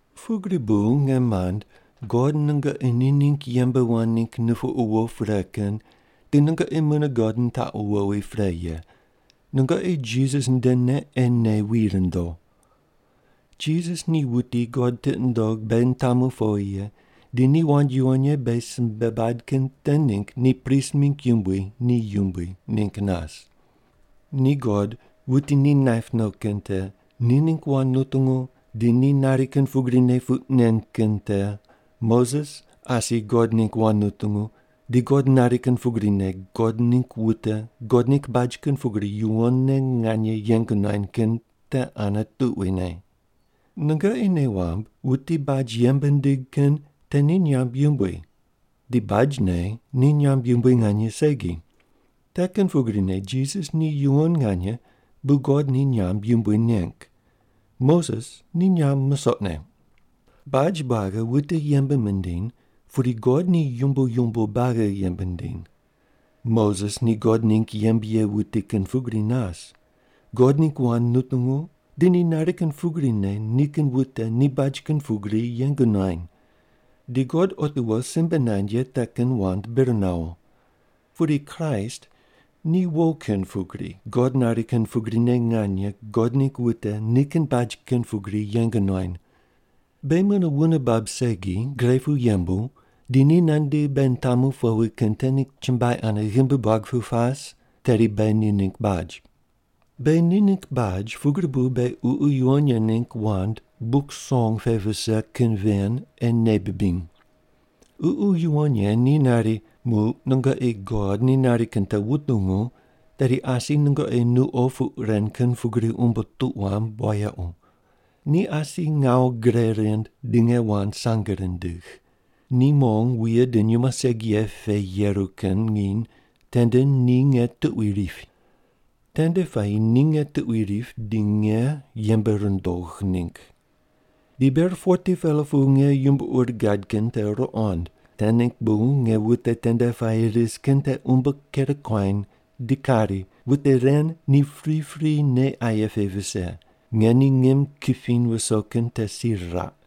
Pugri bu, nge mand, God nungoqi ni ningg yembe wand ningg nupuqu wo pre kin di nungoqi mune God nitaqu wowi pre ye, nungoqi Jisas ndene ei nei wi rundo. Jisas ni wuti God tiqi nundog beghi nitamu powi ye di ni wand yuwon ye beghi simbe bad kin te ningg ni prist mingg yumbui ni yumbui ningg nas. Ni God, wuti ni naip no kin te, ni ningg wand nutungu di ni nari kin pugrine puq nen kin te Moses asi God ningg wand nutungu di God nari kin pugrine God ningg wute God ningg baj kin pugri yuwonne nganye yeng nuany kin te ane tuquine. Nungoqi nei wamb wuti baj yembe nindig kin te ni nyamb yumbui di bajne ni nyamb yumbui nganye segi. Te kin pugrine Jisas ni yuwon nganye bu God ni nyamb yumbui neng. Moses ni nyamb musoqne. Baj buagi wute yembe mindiny, pudi God ni yumbo yumbo buagi yembe nindiny. Moses ni God ningg yembe ye wuti kin pugri nas, God ningg wand nutungu di ni nari kin pugrine nikin wute ni baj kin pugri yeng nuany. Di God otiwo simbe nand ye te kin wand bir nawo. Pudi Kraist ni wo kin pugri God nari kin pugrine nganye God ningg wute ni kin baj kin pugri yeng nuany. Beghi mune wune bab segi gre pu yembu di ni nandi beghi nitamu powi kin te ningg chumbuai ane ghimbi buag pu pas, tedi beghi ni ningg baj. Beghi ni ningg baj pugri bu beghi Ququ Yuwon Ye ningg wand Buk Song pe vise kin ven ei nei bibiny. Ququ Yuwon Ye ni nari, Muq nungoqi God ni nari kin te wutungu, tedi asi nungoqi nuqo puq ren kin pugri umbo tuq wamb wayequ. Ni asi ngawu gre rind di nge wand sange rindigh. Ni mong wuye di nyumo segi ye pe yeru kin nginy tende ni nge tuqui ripi. Tende puayi ni nge tuqui ripi di nge yembe rundogh ningg. Di ber 40-pela pu nge yumbo ur gad kin te ruqond, te ningg bu nge wute tende puayi ris kin te umbo ker kuany di kari, “Wute ren ni pripri nei aye pe vise. Nge ni ngim kipiny wuso kin te si riraq.”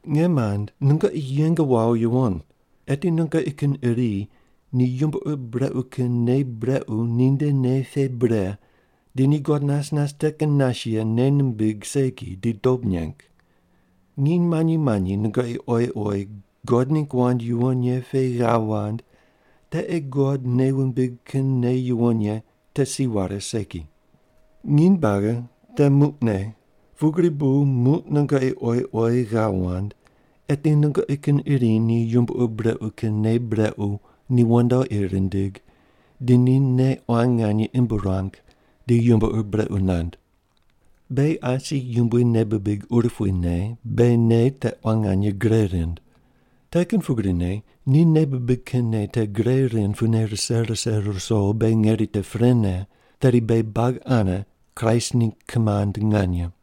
Nge mand nungoqi yeng wawo yuwon, eti nungoqi kin iri ni yumbo ur brequ kin nei brequ ni nde nei pe bre di ni God nas nas te kin nas ye nei nimbig segi di dob neng. Nginy manyi manyi nungoqi oyi oyi God ningg wand yuwon ye pe ghav wand te ei God nei wumbig kin nei yuwon ye te si ware segi. Nginy buagi te “Muqne,” pugri bu muq nungoqi oyi oyi ghav wand, eti nungoqi kin iri ni yumbo ur brequ kin nei brequ ni wandoqi rindig di ni nei quan nganye imb ruang di yumbo ur brequ nand. Beghi asi Yumbui nei bibig urupuine beghi nei te quan nganye gre rind. Te kin pugrine ni nei bibig kin nei te gre rind pune rise rise ruso beghi ngeri te prene, tedi beghi buagi ane Kraist ningg kimand nganye.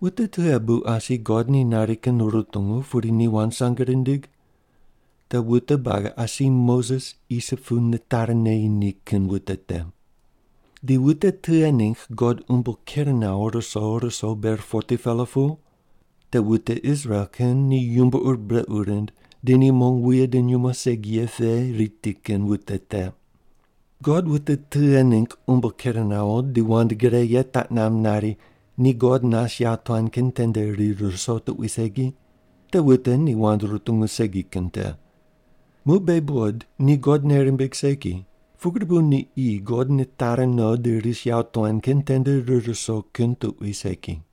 Wute tughe bu asi God ni nari kin rutungu pudi ni wand sange rindig? Te wute buagi asi Moses Isip pu nitari neyi ni kin wute te. Di wute tughe ningg God umbo ker nawo ruso ruso ber 40-pela pu? Te wute Israel kin ni yumbo ur brequ rind di ni mong wuye di nyumo segi ye pe riti kin wute te. God wute tughe ningg umbo ker nawo di wand gre ye taq namb nari ni God nas yawotuan kin tende rir ruso tuqui segi? Te wute ni wand rutungu segi kin te. Muq beghi buqod ni God nei rimbig segi, pugri bu ni qi God nitari no di ris yawotuan kin tende rir ruso kin tuqui segi.